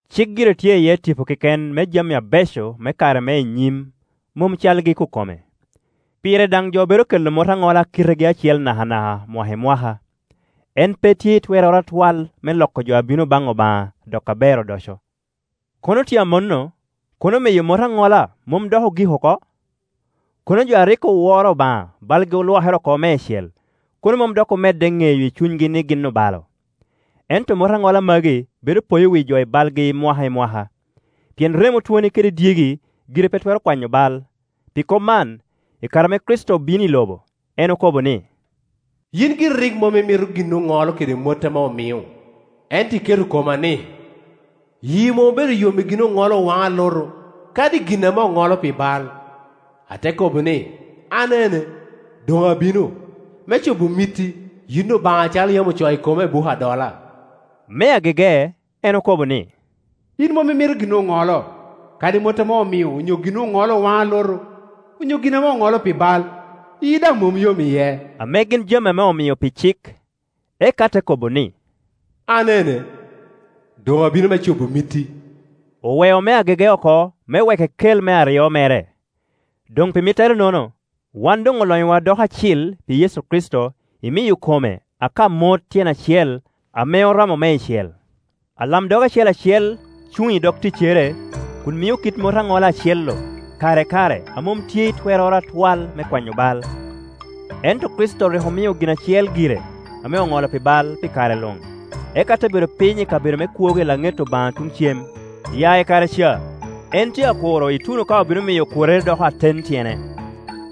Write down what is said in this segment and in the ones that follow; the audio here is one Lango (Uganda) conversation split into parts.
Cik gire tye iye tipo keken me jami abeco me kare me i nyim, mom calgi ikokome. Pire daŋ jo bedo kela mot aŋola a kitegi acel nakanaka, mwaka i mwaka. En pe tye i twerroro atwal me loko jo a bino baŋ Obaŋa doko aber odoco. Kono tye amanno, kono miyo mot aŋola mom doŋ ogik oko? Kono jo a rik oworo Obaŋa balgi olwokere oko meicel, kono mom dok omedde ŋeyo i cunygi ni gin obalo. Ento mot aŋola magi bedo poyo wi jo i balgi mwaka i mwaka, pien remo twoni kede dyegi gire pe twero kwanyo bal. Pi kop man, i kare ame Kricito bino i lobo, en okobo ni, “Yin giri rik mom imito gin oŋolo kede mot ame omio, ento iketo koma-ni, Yii mom obedo yom i gin oŋolo owaŋo alutu, kadi i gin ame oŋolo pi bal. Ate kobo ni, ‘An ene, doŋ abino, me cobo mitti, yin Obaŋa’, acalo yam ocoo i koma i buk adola.” Me agege en okobo ni, “Yin mom imito gin oŋolo, kadi mot ame omio onyo gin oŋolo owaŋo alutu, onyo gin ame oŋolo pi bal, yii daŋ mom yom iye,” ame gin jami ame omio pi cik. Eka te kobo ni, “An ene, doŋ abino me cobo mitti.” Oweo me agege oko me wek ekel me aryo mere. Doŋ pi mitterenono, wan doŋ olonyowa doko acil pi Yecu Kricito imiyo kome aka mot tyen acel ame oromo meicel. Alamdog acel acel cuŋ i dog ticcere kun mio kit mot aŋola acel-Iu kare i kare a mom tye i twerroro atwal me kwanyo bal. Ento Kricito rik omio gin acel gire ame oŋolo pi bal, pi kare luŋ, eka te bedo piny i kabedo me kwogo i laŋet Obaŋa tuŋ cem. Ya i kare ca en tye a kuro ituno ka obino miyo okworrerre doko aten tyene,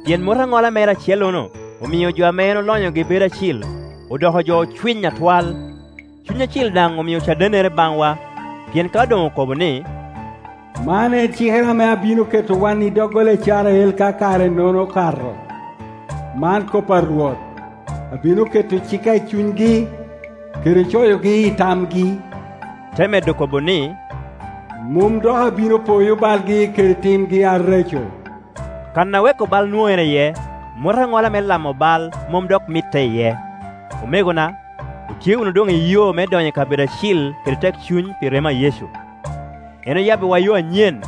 pien mot aŋola mere acellono omio jo ame en olonyogi bedo acil odoko jo ocwiny atwal. Cuny Acil daŋ omio cadennere baŋwa, pien ka doŋ okobo ni. “Man en cikere ame abino keto wan i doggola Icrael ka kare-nono okato, man kop a Rwot: Abino keto cikka i cunygi, kede coyogi i tamgi”, te medo kobo ni, “Mom dok abino poyo balgi kede timgi areco.” Kan a weko bal nwoŋere iye, mot aŋola me lamo bal mom dok mitte iye. Omegona, otye wunu doŋ i yo me donyo i kabedo acil kede tekcuny pi remo a Yecu. En oyabbiwa yo anyen,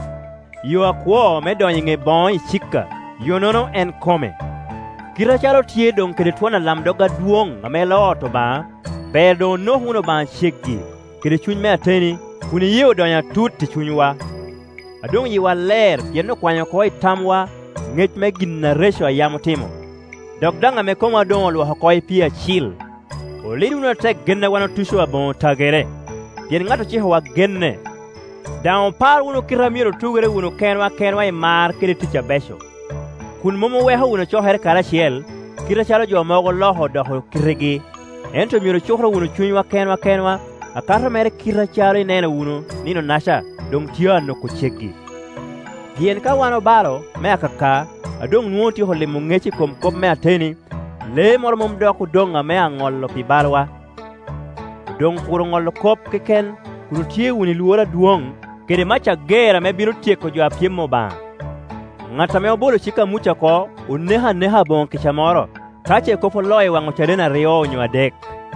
yo akwo me donyo i ŋe boŋo icika, yo-nono en kome. Kite acalo otye doŋ kede twon alamdog adwoŋ ame loo ot Obaŋa, ber doŋ onok wunu Obaŋa ceggi kede cuny me ateni, kun iyee odonyo atut i cunywa, a doŋ yiwa ler pien okwanyo oko i tamwa ŋec me gin areco a yam otimo, dok daŋ ame komwa doŋ olwoko oko i pii acil. Olid wunu atek gen a wan otuco, aboŋo tagere, pien ŋat ocikowa genne. Daŋ opar wunu kite a myero otugere wunu kenwa kenwa i mar kede tic abeco, kun mom oweko wunu cokere karacel, kite acalo jo mogo oloko odoko kitegi, ento myero ocukoro wunu cunywa kenwa kenwa, akato mere kite acalo ineno wunu Nino-naca doŋ tye a noko ceggi. Pien ka wan obalo me akaka a doŋ nwoŋo otyeko limo ŋec i kom kop me ateni, lee moro mom dok odoŋ ame aŋollo pi bal wa. Odoŋ kuro ŋolo kop keken kun otye wunu i lworo adwoŋ, kede mac ager ame bino tyeko jo a pyem Obaŋa. Ŋat ame obolo cik a Muca oko oneko aneka aboŋo kica moro, ka ce kop oloo i waŋ ocaden aryo onyo adek.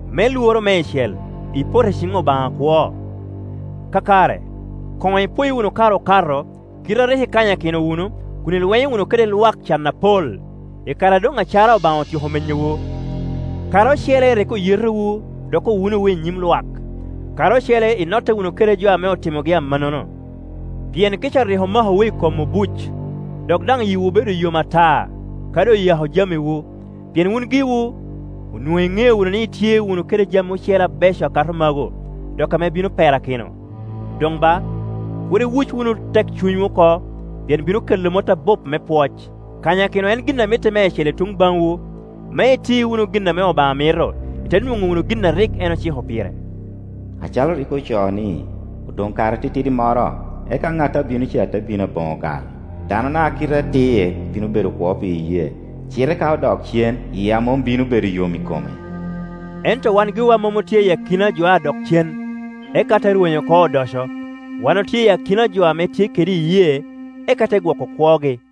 Me lworo meicel, ipoto i ciŋ Obaŋa akwo. Kakare, koŋ ipoyo wunu kare okato, kite a rik ikanyakino wunu, kun ilwenyo wunu kede lwak can apol, i kare a doŋ acara Obaŋa otyeko menyowu. Kare ocele rik oyetowu dok owunowu i nyim lwak, kare ocele inotte wunu kede jo ame otimogi amannono. Pien kica rik omakowu i kom obuc, dok daŋ yiwu obedo yom ata kadi oyako jamiwu, pien wun giwu onwoŋo iŋeo wunu ni itye wunu kede jami ocele abeco akato magu, dok ame bino perakino. Doŋ ba, kur iwuc wunu tekcunywu oko, pien bino kelo mot abup me pwoc. Kanyakino en gin a mitte meicel i tuŋ baŋwu, me iti wunu gin ame Obaŋa mito, ite nwoŋo wunu gin a rik en ociko pire, acalo rik ocoo ni, “Odoŋ kare atitidi moro, eka ŋat a bino ca te bino aboŋo gal. Danona a kite atir bino bedo kwo pi iyee; cite ka odok cen, yia mom bino bedo yom i kome.” Ento wan giwa mom otye i akina jo a dok cen, eka te rwenyo oko odoco; wan otye i akina jo ame tye kede iyee, eka te gwoko kwogi.